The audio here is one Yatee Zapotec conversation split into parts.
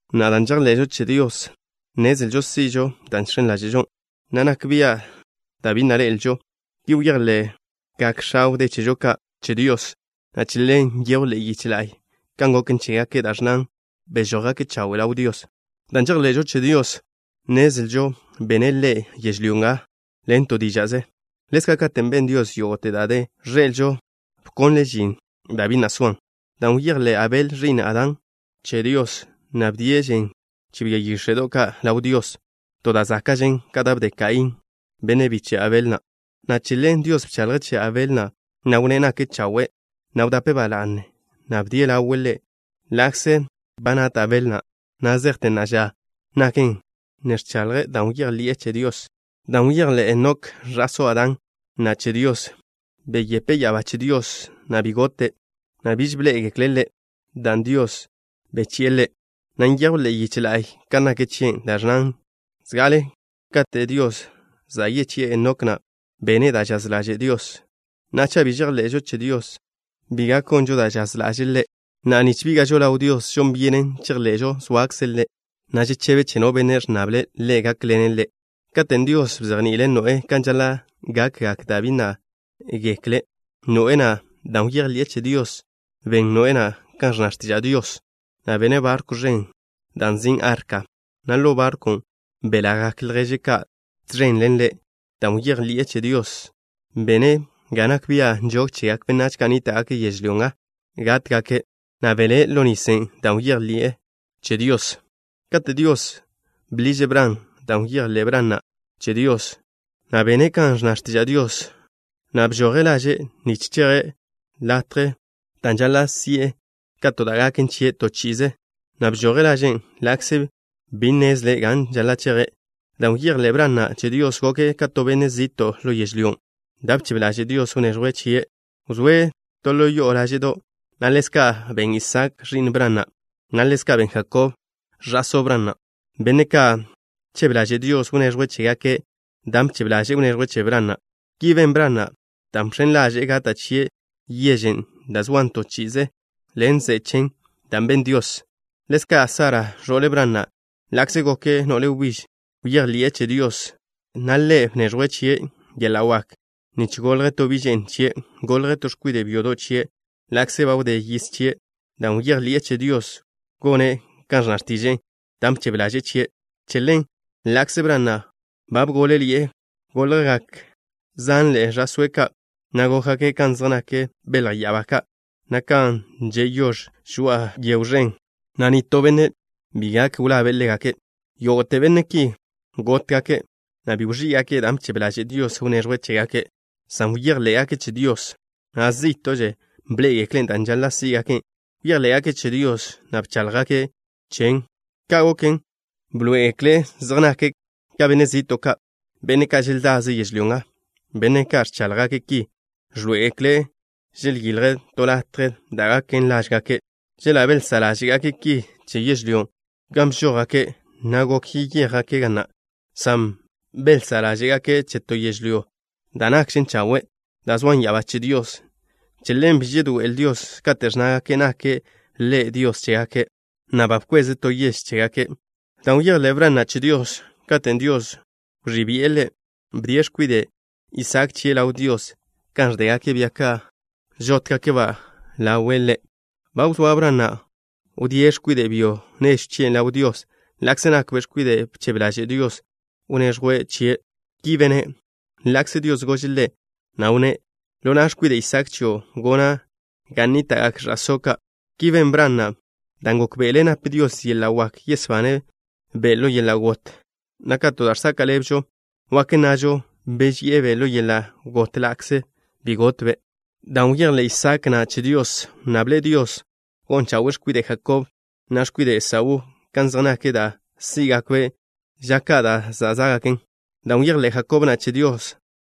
Na'a, dan' žejḻe'žo che Dios, nnezlžo si'žo da' žx̱en ḻáže'žo, na' nak bia' da' bi na' ḻe'elžo. Ki bejḻe'gak x̱a wdé chežo ka' che Dios, na' che ḻen nyejw ḻe'e yiche la'y kan goken chégake', da' ẕnnan: “Bežójgake' chawe' ḻaw Dios.” Dan' žejḻe'žo che Dios, nnezlžo bene' Ḻe' yežlyó nga ḻen to díža'ze. Ḻezka', katen' ben Dios yógo'te da' ẕḻe'elžo, bkonle' žin da' bi na' soan. Dan' bejḻé' Abel, ẕi'n Adán, che Dios, na' bdie' žen che bia yíx̱e'do' ka' ḻaw Dios, to da' záka'žen ka da' bde Kaín, bi' bíche'be' Abel na' ḻaw Dios, na' che ḻen Dios bchaḻje' che Abel na', na' wnné' nake' chawe', na' wdape' ba la'ne dan' bdie' ḻawe' Ḻe'. Ḻa'kze ba nat Abel na', na' zejte na'a ža, naken kan ne ẕchaḻje', dan' bejḻi'e che Dios. Dan' bejḻé' Enok, ẕa'só Adán na' che Dios, wdíe' ya'abá che Dios, na' bi gote', na' biž bḻé'egekle' ḻe', dan' Dios bechi'e ḻe', na' nyejw ḻe'e yiche la'y kan nak chie', da' ẕnnan: “Zga'ale kate' Dios bechi'e ḻe', Enok na' bene' da' žaz ḻaže' Dios.” Na'a, cha' bi žejḻe'žo che Dios, bi gak gonžo da' žaz ḻaže'e Ḻe', na' nich bíga'žo ḻaw Dios, žon byenen chejḻe'žo zoakze' Ḻe', na' žechebe' che no benne' ẕnnable' Ḻe' gákḻene' ḻe'. Katen' Dios bzejni'ile' Noé kan žaḻa' gakgak da' bi na' gekle Noé na', dan' bejḻi'e che Dios, ben Noé na' kan ẕnna x̱tiža' Dios, na' bene' barkw ẕen na' da' nzin' Arka, na' ḻo barkwn' belagak lježe' ka' tẕen ḻen ḻe'. Dan' bejḻi'e che Dios, bene' ga nak bia' nžog chegak benách ka' nníta'gake' yežlyó nga gátgake', na' belé' ḻo nisen' dan' bejḻi'e che Dios. Katen' Dios bḻiže' Bran, dan' bejḻé' Bran na' che Dios, na' bene' kan ẕnna x̱tiža' Dios na', na' bezé'e laže' nich cheje' ḻo latjen' da' žaḻa' si'e ka to da' gaken chie' to chi'ize, na' bžoje' laže' ḻa'kze bi wnnezle' gan žaḻa' cheje'. Dan' bejḻé' Bran na' che Dios, goke' ka to benne' zi'to' ḻo yežlyón' da' bchebe ḻaže' Dios wneẕjwe' chie'. Wzóe' to ḻo yo'o láže'do', na' ḻezka' ben Isaak, ẕi'n Bran na', na' ḻezka' ben Jakob, ẕa'só Bran na', benne' ka' bchebe ḻaže' Dios wneẕjwe' chégake' dan' bchebe ḻaže'e wneẕjwe' che Bran na'. Ki ben Bran na', dan' bx̱en ḻaže'e gata' chie' yežen' da' zoan to chi'ize ḻen ze'e chen, dan' ben Dios. Ḻezka' Sara, ẕo'le Bran na', ḻa'kze goke' no'le wbíž, bejḻi'e che Dios, na' Ḻe' bneẕjwe' chie' yeḻa' wak nich golj to bi' že'n chie'. Golj to x̱kwide' byodo' chie' ḻa'kze ba wdé yiz chie', dan' bejḻi'e che Dios gone' kan ẕnna x̱tiže'e da' bchebe ḻaže'e chie'. Che ḻen, ḻa'kze Bran na' ba bgól-ḻi'e, goljgak zanḻe'e ẕa'sóe' ka', na' gókgake' kan zej nak belj ya'abá ka', na' kan že' yož žoa'a to yego ẕen, na' nitó benne' bi gak wlabe' ḻégake'. Yógo'te benne' ki gótgake', na' bi wẕí'gake' dan' bchebe ḻaže' Dios wneẕjwe' chégake', san bejḻé'gake' che Dios, na' zí'to'ze bḻé'egekle' dan' žaḻa' sí'gake'. Bejḻé'gake' che Dios, na' bcháḻjgake' chen. Ka' goken, bḻoé'egekle' zej nake' ka benne' zi'to' ka', benne' ka' želdaze' yežlyó nga. Benne' ka' ẕcháḻjgake' ki, ẕḻoé'egekle' želyilje' to latje da' gaken lážgake'. Chela' belzá' ḻáže'gake' ki che yežlyó gan bžójgake', na' gok yeyéjgake' ga na', san belzá' ḻáže'gake' che to yežlyó da' nakžen chawe', dan' zoan ya'abá che Dios. Che ḻen bi žedoé'el Dios kate' ẕnnágake' nake' Ḻe' Dios chégake', na' ba bkweze' to yež chégake'. Dan' bejḻé' Bran na' che Dios, katen' Dios wẕí' bi'e ḻe', bdie' x̱kwide' Isaak chie' ḻaw Dios kan ẕdégake' bia ka' žótgake'-ba' ḻawe' Ḻe'. Ba wzóa Bran na' wdíe' x̱kwide' byo nežw chie' ḻaw Dios ḻa'kze nakbe' x̱kwiden' bchebe ḻaže' Dios wneẕjwe' chie'. Ki bene' ḻa'kze Dios gože' ḻe', na' wnné': “Ḻona' x̱kwide' Isaak chio' gona' ga nníta'gak ẕa'só' ka'.” Ki ben Bran na' dan' gókbe'ele' nap Dios yeḻa' wak yesbane'-be' ḻo yeḻa' got, na' ka to da' žsaka' ḻebžo, wak nnažo bezi'e-be' ḻo yeḻa' got ḻa'kze bi gotbe'. Dan' bejḻé' Isaak na' che Dios, wnnable' Dios gon chawe'e x̱kwide' Jakob, na' x̱kwide' Esaú, kan zej nak da' sí'gakbe' ža ka' da' zá'gaken. Dan' bejḻé' Jakob na' che Dios,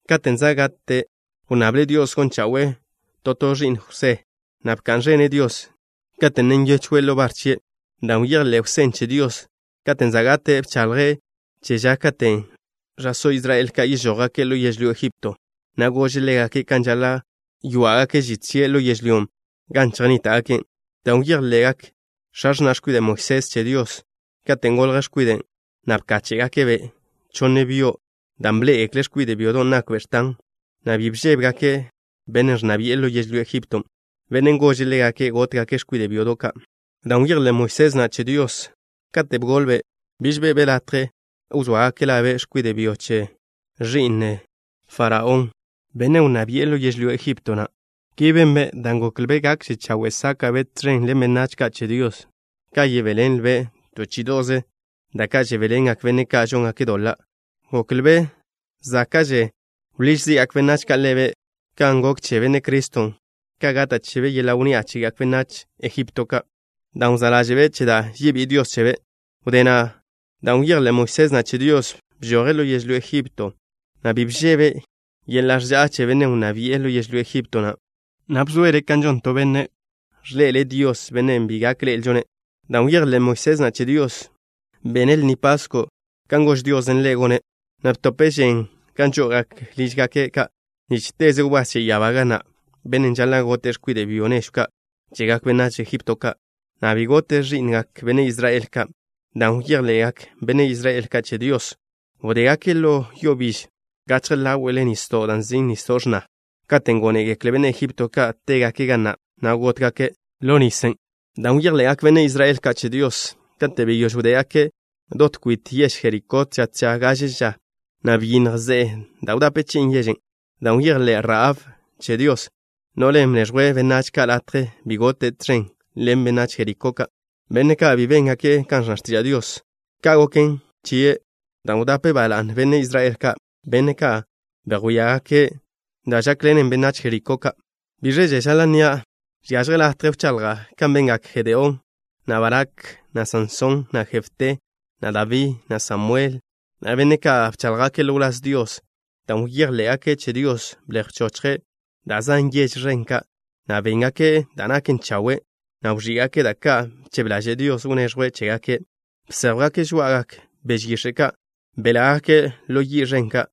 katen' za' gate' wnnable' Dios gon chawe'e to to ẕi'n Jwsé, na' bka'n ẕene' Dios, kate' ne nyechwe' ḻo bar chie'. Dan' bejḻé' Jwsén' che Dios, katen' za' gate', bchaḻje' che ža katen' ẕa'só Israel yežójgake' ḻo yežlyó Egipto, na' gože' ḻégake' kan žaḻa' chjwá'gake' žit chie' ḻo yežlyón' gan chejnníta'gake'. Dan' bejḻe'gak x̱a x̱na' x̱kwide' Moisés che Dios, katen' golj x̱kwiden', na' bkáche'gake'-be' chonne byo', dan' bḻé'egekle' x̱kwide' byodon' nakbe' x̱tan, na' bi bžébegake' bennen' ẕnna bi'e ḻo yežlyó Egipto, bennen' gože' ḻégake' gótgake' x̱kwide' byodo' ka'. Dan' bejḻé' Moisés na' che Dios, kate' bgolbe', biž be'be' latje wzóagake' labe' x̱kwide' byo che ẕi'n no'le Benne' Faraón, bennen' wnná bi'e ḻo yežlyó Egipto na'. Ki benbe' dan' goklbe' gakže chawe' sáka'be' tẕen ḻen benách ka' che Dios ka yebéḻenlbe' to chí'ido'ze da' ka' žebéḻengekle benne' ka' žóngake' doḻa'. Goklbe' záka'že wḻíž zi'gak benách ka' ḻebe', kan gok che Benne' Criston', ka gata' chebe' yeḻa' wnni'a chegak benách Egipto ka', dan' wzá' ḻáže'be' che da' yebí'i Dios chebe'. Wdé na', dan' bejḻé' Moisés na' che Dios, bžoje' ḻo yežlyó Egipto, na' bi bžebe' yeḻa' ẕža'a che bennen' wnná bi'e ḻo yežlyó Egipto na', na' bzoele' kan žon to benne' ẕḻe'ele' Dios, Bennen' bi gak ḻe'elžo-ne'. Dan' bejḻé' Moisés na' che Dios, bene' Lni Pasko' kan gož Diosen' ḻe' gone', na' btope' žen gan žó'ogake' lížgake' ka', nich teze wbás che ya'abá ga na', bennen' žaḻa' gote' x̱kwide' byo nežw ka' chegak benách Egipto ka', na' bi gote' ẕi'ngak benne' Israel ka'. Dan' bejḻe'gak benne' Israel ka' che Dios, wdégake' ḻo yo biž gachje ḻáwe'le nisdo' da' nzin' Nisdo' X̱na. Katen' gónegekle benne' Egipto ka' tégake' ga na', na' gótgake' ḻo nisen'. Dan' bejḻe'gak benne' Israel ka' che Dios, kate' beyóž wdégake' dot kwit yež Jerikó tža tža gaže ža, na' byinnj ze'e da' wdape chi'in yežen'. Dan' bejḻé' Rahab che Dios, no'len' bneẕjwe' benách ka' latje, bi gote' tẕen ḻen benách Jerikó ka', benne' ka' bi béngake' kan ẕnna x̱tiža' Dios. Ka' goken chie' dan' wdape' ba la'ne benne' Israel ka', benne' ka' bedjwíalangake' da' žákḻenen benách Jerikó ka'. ¿Bíẕaže žaḻa' nnia'? Žiažje latje wchaḻja' kan bengak Jedeón, na' Barak, na' Sansón, na' Jefté, na' Dabí, na' Samuel, na' benne' ka' bcháḻjgake' ḻo wláz Dios. Dan' bejḻé'gake' che Dios, blej bchóchgake' da' zan yež ẕen ka', na' béngake' da' naken chawe', na' wẕí'gake' da' ka' bchebe ḻaže' Dios wneẕjwe' chégake'. Bséjwgake' žoá'agak beže yix̱e' ka'. Belágake' ḻo yi' ẕen ka'.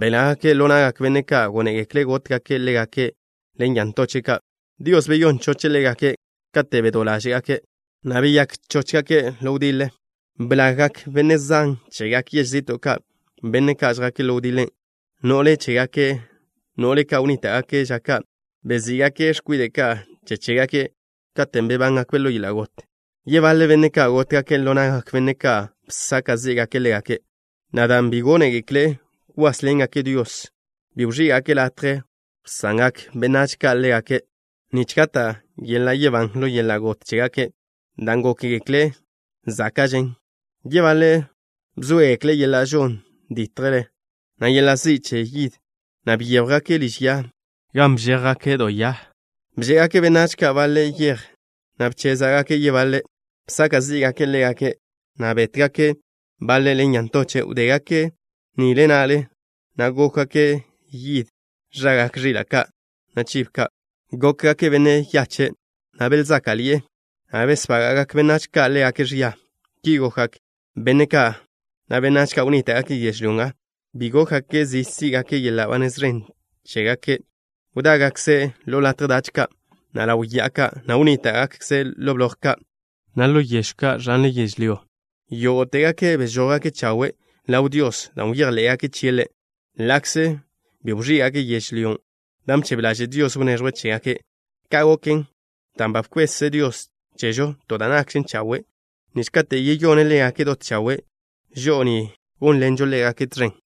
Belágake' ḻo na'gak benne' ka' gónegekle' gótgake' ḻégake' ḻen ya ntoche' ka'. Dios beyón choche' ḻégake' kate' bedó ḻáže'gake', na' beyák chóchgake' ḻo wdiḻe. Blággake' benne' zan chegak yež zi'to' ka', benne' ka' žjake' ḻo wdiḻe. No'le chégake', no'le ka' wnníta'gake' ža ka', bezí'gake' x̱kwide' ka' che chégake' katen' bebángakbe' ḻo yeḻa' got. Yebaḻe benne' ka' gótgake' ḻo na'gak benne' ka' bsaka' zí'gake' ḻégake', na' dan' bi gónegekle' kwásḻengake' Dios, bi wẕí'gake' latje wsangak benách ka' ḻégake', nich gata' yeḻa' yebán ḻo yeḻa' got chégake', dan' gókgekle' záka'žen. Yebaḻe' bzóegekle' yeḻa' žon ditjle, na' yeḻa' zi' che yid, na' byéjwgake' liž ya, gan bžéjgake' do ya. Bže'egak benách ka' baḻe' yej, na' bchéza'gake' yebaḻe'. Bsaka' zí'gake' ḻégake', na' bétgake' baḻe' ḻen ya ntoche'. Wdégake' nile na'le, na' gókwgake' yid ẕagak ẕila' ka', na' chibo ka'. Gókgake' benne' yache', na' belzáka'ḻi'e, na' besbága'gak benách ka' ḻégake' ẕia. Ki gokgak benne' ka', na' benách ka' wnníta'gake' yežlyó nga bi gókgake' zi sí'gake' yeḻa' ba nez ẕen chégake'. Wdágakze' ḻo latje dach ka', na' ḻaw ya'a ka', na' wnníta'gakze' ḻo bloj ka', na' ḻo yežw ka' ẕan yo. Yógo'tegake' bežójgake' chawe' ḻaw Dios dan' bejḻé'gake' chie' Ḻe', ḻa'kze bi wẕí'gake' yežlyón' da' bchebe ḻaže' Dios wneẕjwe' chégake'. Ka' goken, dan' ba bkwez Dios chežo to da' nakžen chawe' nich katen' yeyone' ḻégake' dot chawe', žo'o ni gónḻenžo ḻégake' tẕen.